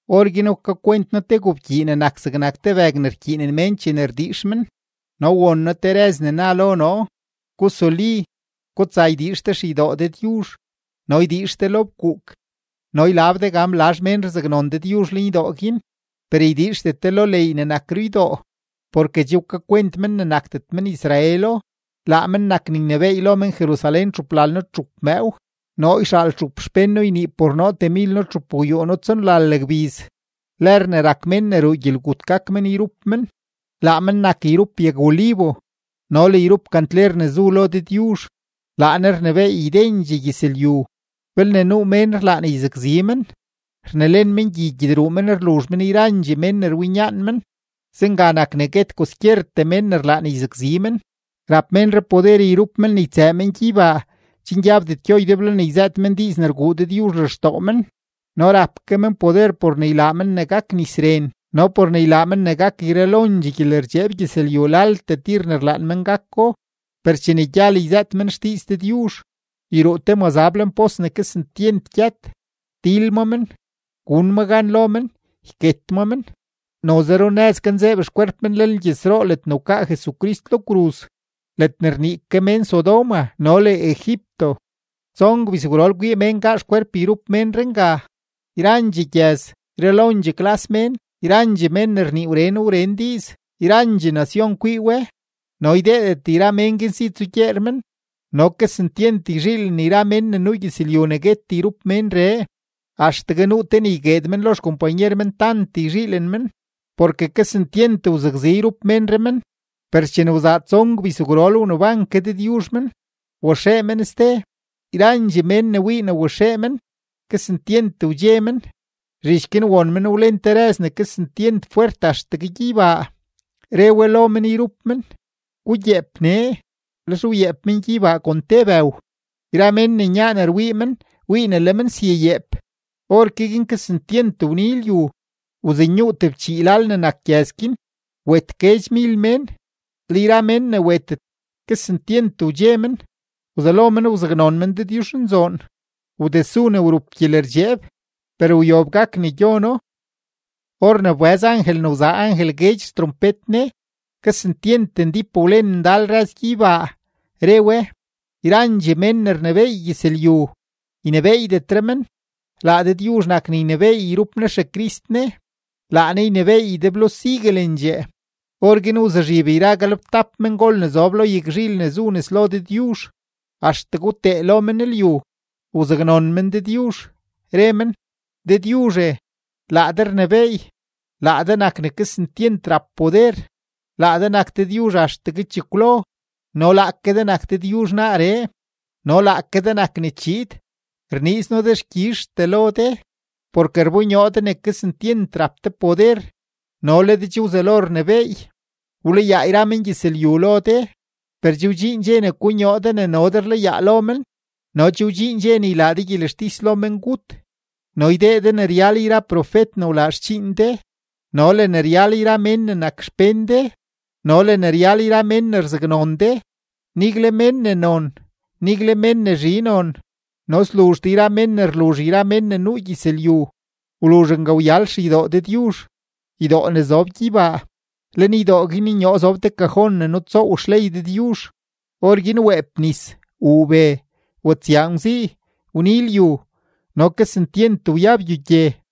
Orguin wkakwent noo te gobkyii ne nak zegnak te bëg ne rkyiinen mén chene rdiix men, no won noo te rëz ne na lo noo: ―Gusuli, gutsa ydiix de xeydoo Dëdyuzh no ydiix de lo fkuuk no ylab de gan blazh mén rzaknon Dëdyuzh lenydoo guin. Per ydiixdet de lo leey ne nak ruydoo, porke che wkakwent men ne nakdet men-Israelo; laa men nak ne ynebééy lo men-Jerusalén txuplalno-txup mëëw. Noo yxaal txup xpén noo ynii por noo temilno-txupgwyuuno-tsonlal gbiz; lër ne rak mén ne ruu gyelgut gak men yrup men. Laa men nak yrup yag-olivo no le yrup kantler ne zu lo Dëdyuzh; laa Ne rnebééy ydendxee gyëzlyu. Belne nuu mén rlaan yzakzi men, rnelen men gyi gyedruu men rluzh men yrandxee mén ne rwinyaan men. Zenga nak ne guet kwaskyertee mén ne rlaan yzakzi men. Rap ménree poder yrup men ne ytsëë men gyeybaa chen gyabdet gyo ydeblo ne yzëët men diiz ne rguu Dëdyuzh lextoo men no rap ke men poder por ne ylaa men ne gak nis ren no por ne ylaa men ne gak yralondxee gyelerdxeeb gyëzlyu laltee tir ne rlaan men gako. Per chene gyal yzëët men xdiiz Dëdyuzh, yruu te mazab lenpos ne kesentyent gyët, til ma men, gun ma gan lo men, yket ma men. Noze runëz ganzeeb xkwerp men lenlgyëzroo ledne wkaa Jesucrist lo kruz, ledne rnii ke mén Sodoma no le Egipto. Tson gbizgwrol kwii mén gaa xkwerp yrup ménree nga; yrandxee gyëz, yralondxee klas mén, yrandxee mén ne rnii wren wren diiz, yrandxee nacion kwii we, no ydeedet yra mén guin si tsugyeer men. No kesentyent yzhiilen yra mén ne nuu gyëzlyu ne guet yrup ménree, axtegue nuu te ne ygueed men lo xkompanyer men tant yzhiilen men, porke kesentyent wzakzi yrup ménree men. Per chene wzaa tson gbizgwrol wneban ke Dëdyuzh men, waxee men ste; yrandxee mén ne wii ne waxee men, kesentyent wdxe men. Zhich guin won men wlen te rëz ne kesentyent fwert axtegue gyeybaa, re we lo men yrup men: ―¡Gugyeep nee! Lex wyeep men gyeybaa kon te bëw; yra mén ne nyaan rwii men wii ne le men syayeep. Orke guin kesentyent wni lyu, wzenyuu tebchii lal ne nak gyëz guin, wet guedxmil mén. Le yra mén ne wetet, kesentyent wdxe men, wzelo men wzaknon men Dëdyuzhnzoon. Wdesu ne wrup gyelerdxeeb, per wyob gak ne gyono. Or ne wbëz angel ne wzaa angel guedx xtrompet ne, kesentyent ndíp wlen ndal rëz gyeybaa, re we: Yrandxee mén ne rnebééy gyëzlyu, ynebééydetre men; laa Dëdyuzh nak ne ynebééy yrup Ne XeCrist Ne; laa Ne ynebééy ydeblo siguelendxee. Orguin wzuzhib yra galebtap mengol ne zob lo yagzhil ne zu nes lo Dëdyuzh axtegue wtee lo men lyu, wzaknon men Dëdyuzh, re men: Dëdyuzhe, laa de rnebééy, laa de nak ne kesentyent rap poder, laa de nak Dëdyuzh axtegue chekwlo no laake de nak Dëdyuzh naaree no laake de nak ne chiid, rniiz noo dexkyizhtee lo de, porke rbonyoo de ne kesentyent rap de poder no le de che wzelo rnebééy. Wlayaa yra mengyëzlyu lo de, per che wdxiin dxe ne konyoo de ne no de rlayaa lo men no che wdxiin dxe ne ylaa de gyelextis lo mengut no ydee de ne ryal yra profet ne wlaa xdxiin de no le ne ryal yra mén ne nak xpén de no le ne ryal yra mén ne rzaknon de, nigle men ne non, nigle men ne zhi non, no sluzh de yra mén ne rluzh yra mén ne nuu gyëzlyu. Wluzh nga wyal xeydoo Dëdyuzh, ydoo ne zob gyeybaa; lenydoo guin nyoo zob te kajon ne nutsoow xley Dëdyuzh; orguin weep nis, wuu be, watsyaa ngwzii, wni lyu, no kesentyent wyab gyogye.